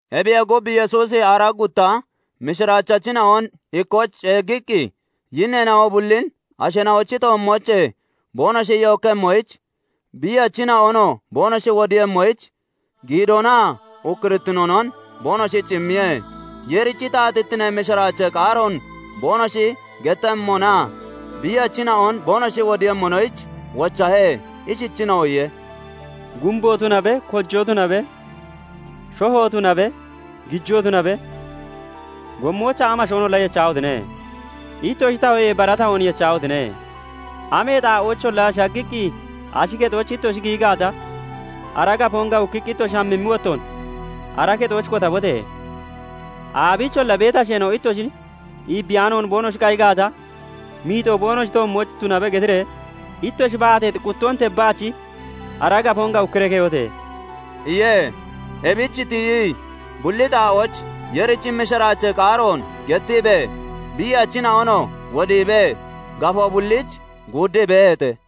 Ebiyee gub, Yesuusi aaraa gutta mishiraachachina'on ikkooch ceeggiqqi yinneena'o bullin asheena'ochi toommoochee boonoshi yookkemmoyich, biiyachina'onoo boonoshi wodiiyemmoyich giidoonaa ukkurittinoonon boonoshich immiye. Yeerichi taatittinee mishiraachee qaaroon boonoshi gettemmonaa biiyachina'on boonoshi wodiiyemmonoyich wochahe. Ishichiinoo iye:- "Gumbo tunabe, kojoo tunabe, shoho tunabe, gijoo tunabe, gommoyich amashoonolla yechahotine! Ittoshi tahatoyee bara tahoon yechahotine! Amee xaa'oocholla shaggiqqi ashi kexooch ittoshi giyi gaata, ara gafoon gawukkiqqi ittoshi hamimmi wottoon ara kexooch kotabote! Aabiicholla beeti asheena'o ittoshin iibbiyaano boonoshi qayi gaata, 'Miixoo boonoshi toommooch tunabe' getiree ittoshi baateexi quttoon tebbaach ara gafoon gawukkiree keyote!" iye. Ebich tiyii bulli xaa'ooch Yeerichi mishiraachee qaaroon gettiibee, biiyachina'onoo wodiibee gafoo bulliich guuddii beeheete.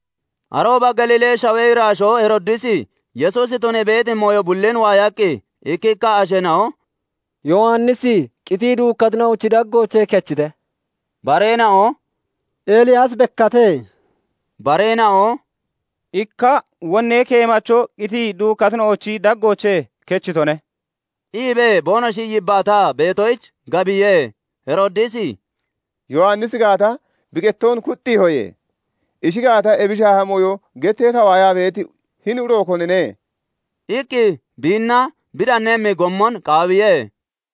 Arooba Galiilee shawee iraashoo Heroodisi Yesuusi tunii beeti mooyo bullin waayaqqi, ikkikka asheena'o " Yowannisi qitii duukkatina'ochi daggoochee kechite", bareena'o "Eliyaasi bekkate", bareena'oo "Ikka wonnee keemacho qitii duukkatina'ochi daggoochee kechitone" iibee boonoshi yibbaataa beetoyich, gaabbiye. Heroodisi "Yowannisi gaata, bi qettoon kuxxiihoye; ishi gaata, ebi shaaha mooyo getee ta waayaa beeti hini uro konine?" iqqi biinna bi danemmi gommon qaawiye.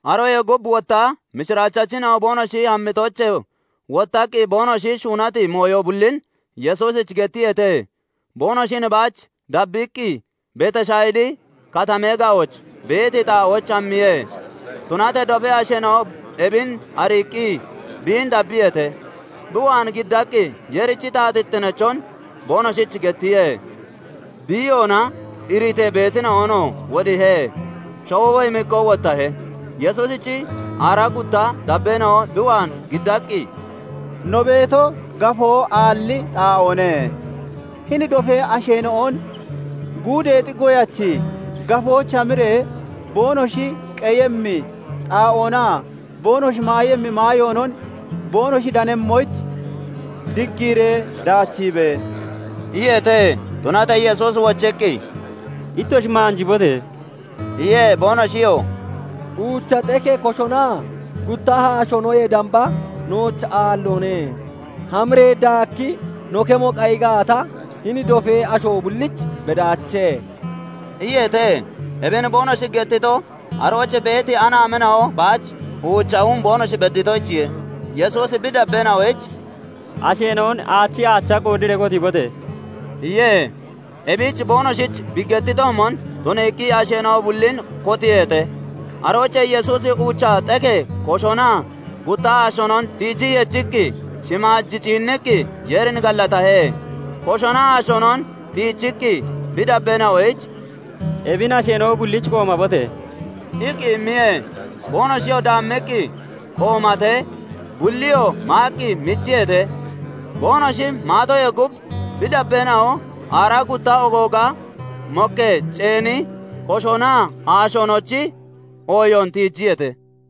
Aroyee gub wotta mishiraachachina'o boonoshi hammitoochee wottaqqi boonoshi shuunati mooyo bullin Yesuusich gettiyeete. Boonoshin baach dabbiiqqi Betashayidi Katamee ga'ooch beeti xaa'ooch hammiye. Tunatee dofee asheena'o ebin ariiqqi biin dabbiyeete; bi waan giddiiqqi Yeerichi taatittineechon boonoshich gettiye; biiyoona iritee beetina'onoo wodiihe. Shawoo woyimikkoo wottahee, Yesuusichi aaraa gutta dabbeena'o bi waan giddaqqi, "No beeto gafoo aalli xaa'oone; hini dofee asheena'on guudeexi goyachi gafooch hamiree boonoshi qeyemmi xaa'oonaa boonoshi maayemmi maayoonon boonoshi danemmoyich diggiiree daachiibe!" iyeete. Tunatee Yesuusi wochiqqi, "Ittoshi maanjibote!" iye. Boonoshiyoo "Uucha xekee koshonaa gutta haashoonoyee damba nooch aalloone; hamiree daakki no kemo qayi gaata, hini dofee asho bullich bedaache" iyeete. Ebin boonoshi gettito, arooch beeti anaamina'o baach uucha hum boonoshi bedditoyichiye. Yesuusi bi dabbeena'oyich "Asheena'on aachi aacha qoodiree kotiibote!" iye. Ebich boonoshich bi gettitoomon tuniiqqi asheena'o bullin kotiiheete. Aroochee Yesuusi uucha xekee koshonaa gutta haashoonon tiijii yechiqqi, shimaaj ciinniqqi Yeerin gallatahe; koshonaa haashoonon tiichiqqi bi dabbeena'oyich "Ebin asheena'o bullich qoomabote!" iqqi immiye. Boonoshiyoo daammiqqi qoomatee, bulliyoo maaqqi michiyeete. Boonoshi maatoyee gub bi dabbeena'o aaraa gutta ogooga mokkee ceeni koshonaa haashoonochi ooyoon tiijiyeete.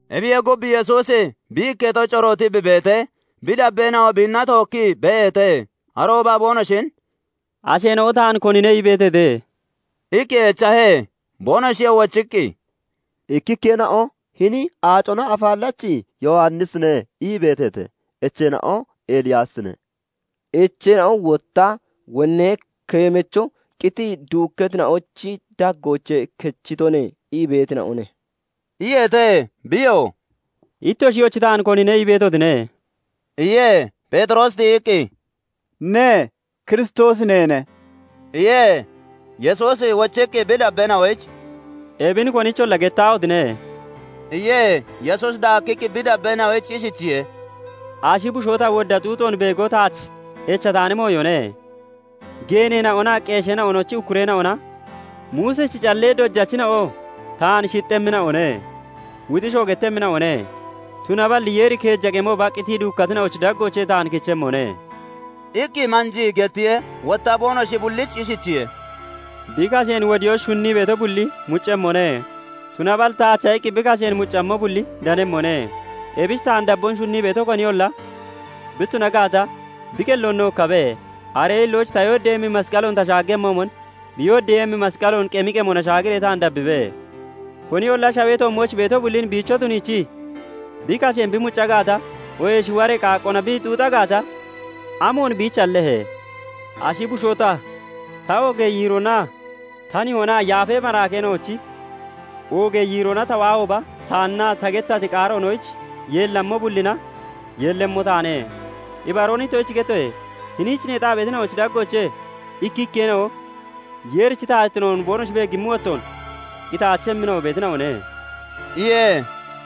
Ebiyee gub, Yesuusi bi ikketo corootii bi beetee, bi dabbeena'o biinna tookkii beeheete. Arooba boonoshin "Asheena'o taan konine ii beeteete?" iqqi echahe. Boonoshiyoo wochiqqi, "Ikkikkeena'o 'Hini Aacona Afaallachi Yowannisine' ii beeteete; echeena'o 'Eliyaasine', echeena'oo wotta 'Wonnee keemacho qitii duukkatina'ochi daggoochee kechitone' ii beetina'one" iyeete. Biyoo "Ittoshiyoochi taan konine ii beetotine?" iye. Pheexiroosi tiyiqqi, "Ne, Kiristoosi neene" iye. Yesuusi wochiqqi bi dabbeena'oyich "Ebin konicholla gettaahotine!" iye. Yesuusi daakkiqqi bi dabbeena'oyich ishichiye:- "Ashi bushoo ta wodda xuuxoon beego taach echataani mooyone. Geeneena'onaa qeesheena'ochi ukkureena'ona, Muusichi callee dojachina'oo taan shixxemmina'one; wuxiishoo gettemmina'one; tunaballi Yeeri keeja qemooba qitii duukkatina'ochi daggoochee taan kichemmone" iqqi manjii gettiye. Wotta boonoshi bullich ishichiye:- "Bi kasheen wodiyoyich shunnii beeto bulli muccemmone; tunaballi taacha iqqi bi kasheen muccammo bulli danemmone. Ebich taan dabboon shunnii beeto koniyolla bi tuna gaata, bi qelloon nookkabe; aree hillooch ta yooddeeyemmi masqaloon ta shaaggemmoomon, bi yooddeeyemmi masqaloon qemi qemona shaagiree taan dabbibe. Koniyolla shawee toommooch beeto bullin biicho tuniichii bi kasheen bi mucca gaata, oohee shiwaree qaaqqoona bi xuuxa gaata, amoon biich hallehe? Ashi bushoo ta, ta oogee yiiroona, ta nihoonaa yaafa maraakeena'onochi oogee yiiroona ta waahooba, taannaa ta gettati qaaroonoyich yeellammo bullina yeellemmo taane. Ibaroon ittoshich gettoye; hiniich neexaa beetina'oochi daggoochee ikkikkeena'o Yeerichi taatittinoon boonoshi beeggimmi wottoon qitaachemmina'o beetina'one" iye.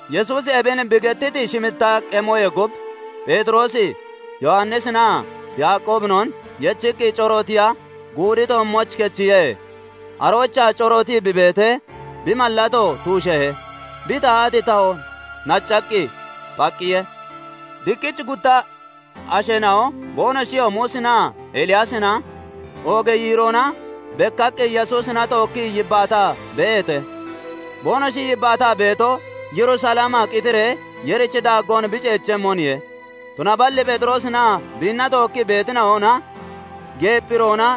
Yesuusi ebin bi gettiti shimmitta qemoyee gub Pheexiroosi, Yowannisinaa Yaaqoobinon yechiqqi corootiya guudi toommooch kechiye. Aroochaa corootii bi beetee, bi mallato tuusheehe; bi tahati tahoo naccaqqi phaqqiye. Diqqichi gutta asheena'o boonoshiyoo Muusinaa Eliyaasina, oogee yiiroona bekkaqqi Yesuusina tookkii yibbaataa beeheete; boonoshi yibbaataa beetoo, Yerusalemaa qitiree Yeerichi daaggoon bi ceechemmoniye. Tunaballi Pheexiroosinaa biinna tookkii beetina'ona geephirona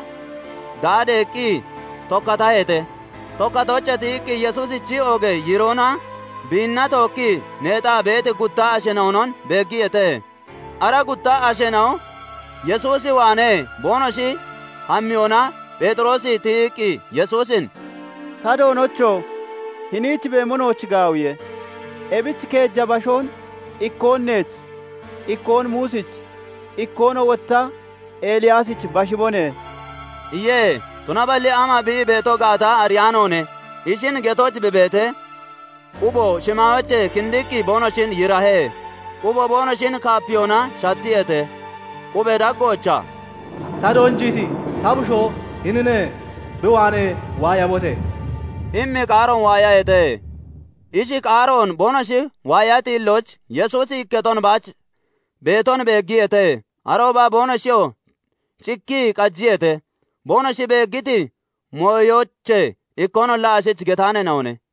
daadeeqqi tokkataheete; tokkatoochee tiyiqqi Yesuusichi oogee yiiroonaa biinna tookkii neexaa beeti gutta asheena'onon beeggiyeete. Ara gutta asheena'o Yesuus waanee boonoshi hammiyona, Pheexiroosi tiyiqqi Yesuusin "Ta Doonocho! Hiniich beemo nooch gaawiye. Ebich keeja bashoon, ikkoon neech, ikkoon Muusich, ikkoonoo wotta Eliyaasich bashibone" iye. Tunaballi ama bi ii beeto gaata ariyaanoone. Ishin getooch bi beetee, qubo shimaayoochee kindiqqi boonoshin yiirahe; quboo boonoshin kaapiyona shattiyeete. qubee daggoochaa "Ta doonjiiti ta bushoo hinine; bi waanee waayabote!" immi qaaroon waayaheete. Ishi qaaroon boonoshi waayati hillooch, Yesuusi ikketon baach beeton beeggiyeete. Arooba boonoshiyoo cikkii qajiyeete; boonoshi beeggiti mooyoochee ikkoonolla ashich getaaneena'one.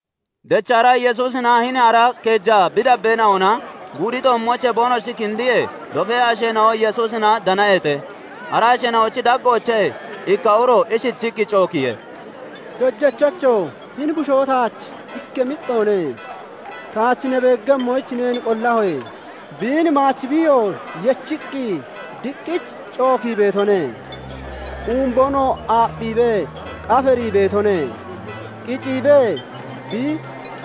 Dechra Yesuusinaa hini ara keeja bi dabbeena'ona guudi toommoochee boonoshi kindiyee, dofee asheena'o Yesuusina danaheete. Ara asheena'ochi daggoochee ikka uro ishichiqqi cookiye; "Dojachocho! Hini bushoo taach ikka mixxoone; taach ne beeggemmoyich neen qollahoye. Biin maachi biiyoo yechiqqi diqqich cookii beetone; umboonoo aapphiibee qafarii beetone; qicciibee bi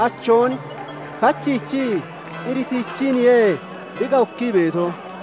achoon kachiichii iritichiiniye bi gawukkii beeto.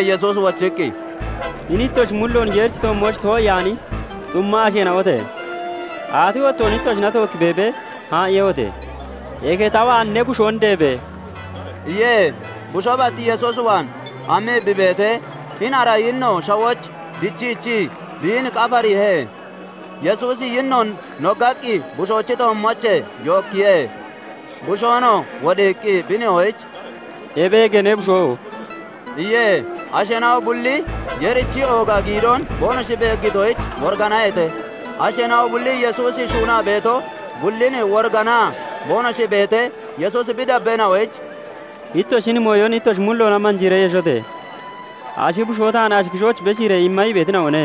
Yesuusi wochiqqi, "Hini ittoshi mulloon Yeerichi toommooch too'iyaani xumma asheena'ote! Aati wottoon ittoshina tookki beebee haa'iiyehote? Eke ta waan ne bushoon deebe!" iye. Bushoo bat Yesuus waan hammii bi beetee, hini ara yinno shawooch dichiichii biin qafariihe; Yesuusi yinnoon noggaqqi bushoochi toommoochee yookkiye; bushoonoo wodiiqqi bi nihoyich "Ebeege ne bushoo!" iye. Asheena'o bulli Yeerichi ooga giidoon boonoshi beeggitoyich woriganaheete. Asheena'o bulli Yesuusi shuunaa beeto bullin woriganaa boonoshi beetee, Yesuusi bi dabbeena'oyich "Ittoshi hini mooyon ittoshi mulloona manjiiree yeshote! Ashi bushoo taan ashi kishooch beshiiree imma ii beetina'one"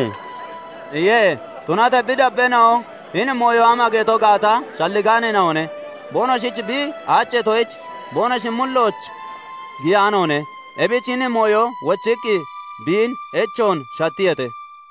iye. Tunatee bi dabbeena'o hini mooyon ama geto gaata shalligaaneena'one; boonoshich bi aacheetoyich, boonoshi mullooch giyaanoone. Ebich hini mooyon wochiqqi biin echoon shattiyeete.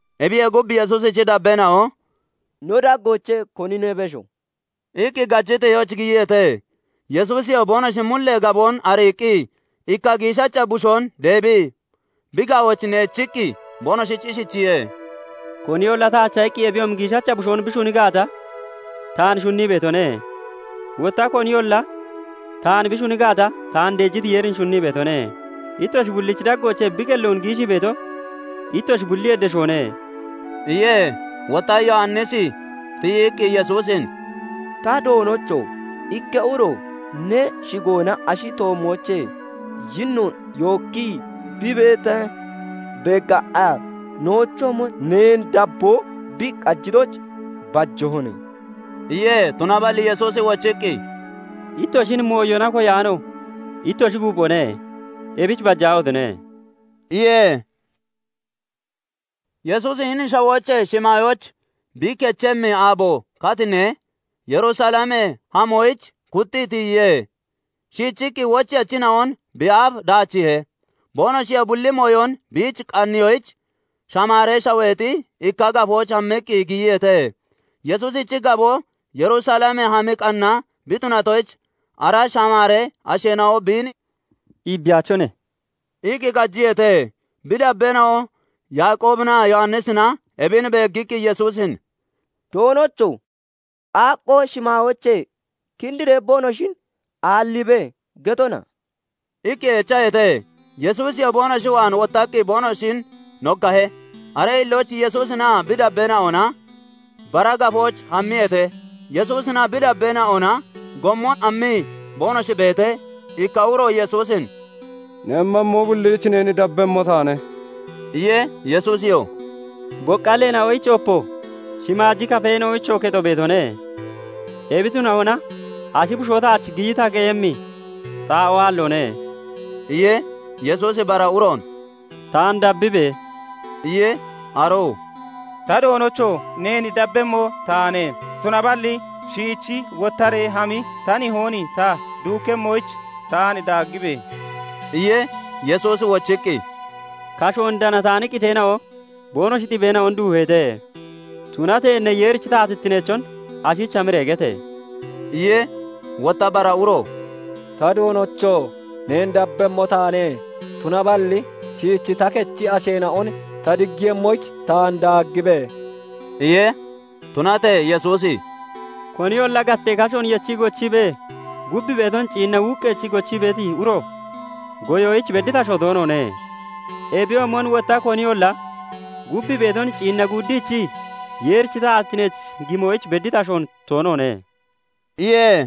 Ebiyee gub, Yesuusichi dabbeena'o "No daggoochee konine besho?" iqqi gajiteyooch giyiyeete. Yesuusiyoo boonoshi mullee gaboon ariiqqi ikka giishacha bushoon deebii bi ga'ooch neechiqqi, boonoshich ishichiye:- "Koniyolla taacha iqqi ebiyoomi giishacha bushoon bi shuni gaata taan shunnii beetone; wotta koniyolla taan bi shuni gaata, taan deejiti Yeerin shunnii beetone; ittoshi bullichi daggoochee bi qelloon giishii beeto ittoshi bulliyee beshoone" iye. Wotta Yowannisi tiyiqqi Yesuusin "Ta Doonocho! Ikka uro ne shigoona ashi toommoochee yinnoon yookkii bi beetee beeggaqqa, noochoomon neen dabboo bi qajitoyich bajahone" iye. Tunaballi Yesuusi wochiqqi "Ittoshin mooyona koyaano ittoshi guuphone; ebich bajaahotine!" iye. Yesuusi hini shawoochee shimaayooch bi kechemmi aabo katinee, Yerusalem hamoyich kuxxii tiyiye. Shiichiqqi wocheyachina'on bi aaf daachiihe. Boonoshiyoo bulli mooyon biich qanniyoyich Shamaaree Shaweexi ikka gafooch hammiqqi giyiyeete. Yesuusichi gaboo Yerusalem hammi qanna bi tunatoyich, ara Shamaaree asheena'o biin "Iibbiyaachone" iqqi qajiyeete. Bi dabbeena'o Yaaqoobinaa Yowannisina ebin beeggiqqi Yesuusin "Doonocho! 'Qaaqqoo shimaayoochee kindiree boonoshin aalliibe' getona?" iqqi echaheete. Yesuusiyoo boonoshi waan wottaqqi boonoshin noggahe. Aree hillooch Yesuusinaa bi dabbeena'ona bara gafooch hammiyeete. Yesuusinaa bi dabbeena'ona gommon hammii boonoshi beetee, ikka uro Yesuusin "Ne hammammo bulliich neen dabbemmo taane" iye. Yesuusiyoo "Boqqalleena'oyich opo, shimaaji kafeena'oyichoo kexo beetone; ebi tunahona ashi bushoo taach giyi ta qeyemmi xaa'oo aalloone" iye. Yesuusi bara uroon "Taan dabbibe!" iye. Aroo "[ta Doonocho!] Neen dabbemmo taane; tunaballi shiichi wottaree hami ta nihoon ta duukkemmoyich taan daaggibe!" iye. Yesuusi wochiqqi, "Kashoon danataani qiteena'o boonoshi xibeena'on duuheete; tunatee ne Yeerichi taatittineechon ashich hamiree gete!" iye. Wotta bara uro "Ta Doonocho! Neen dabbemmo taane; tunaballi shiichi ta kechi asheena'on ta diggiiyemmoyich taan daaggibe!" iye. Tunatee Yesuusi "Koniyolla gattee kashoon yechii gochiibee, gub beeton ciinna wuuqqeechii gochii beeti uro goyoyich bedditi asho toonoone; ebiyoomon wotta koniyolla gub beeton ciinna guuddichii Yeerichi taatittineech gimoyich bedditi ashoon toonoone" iye.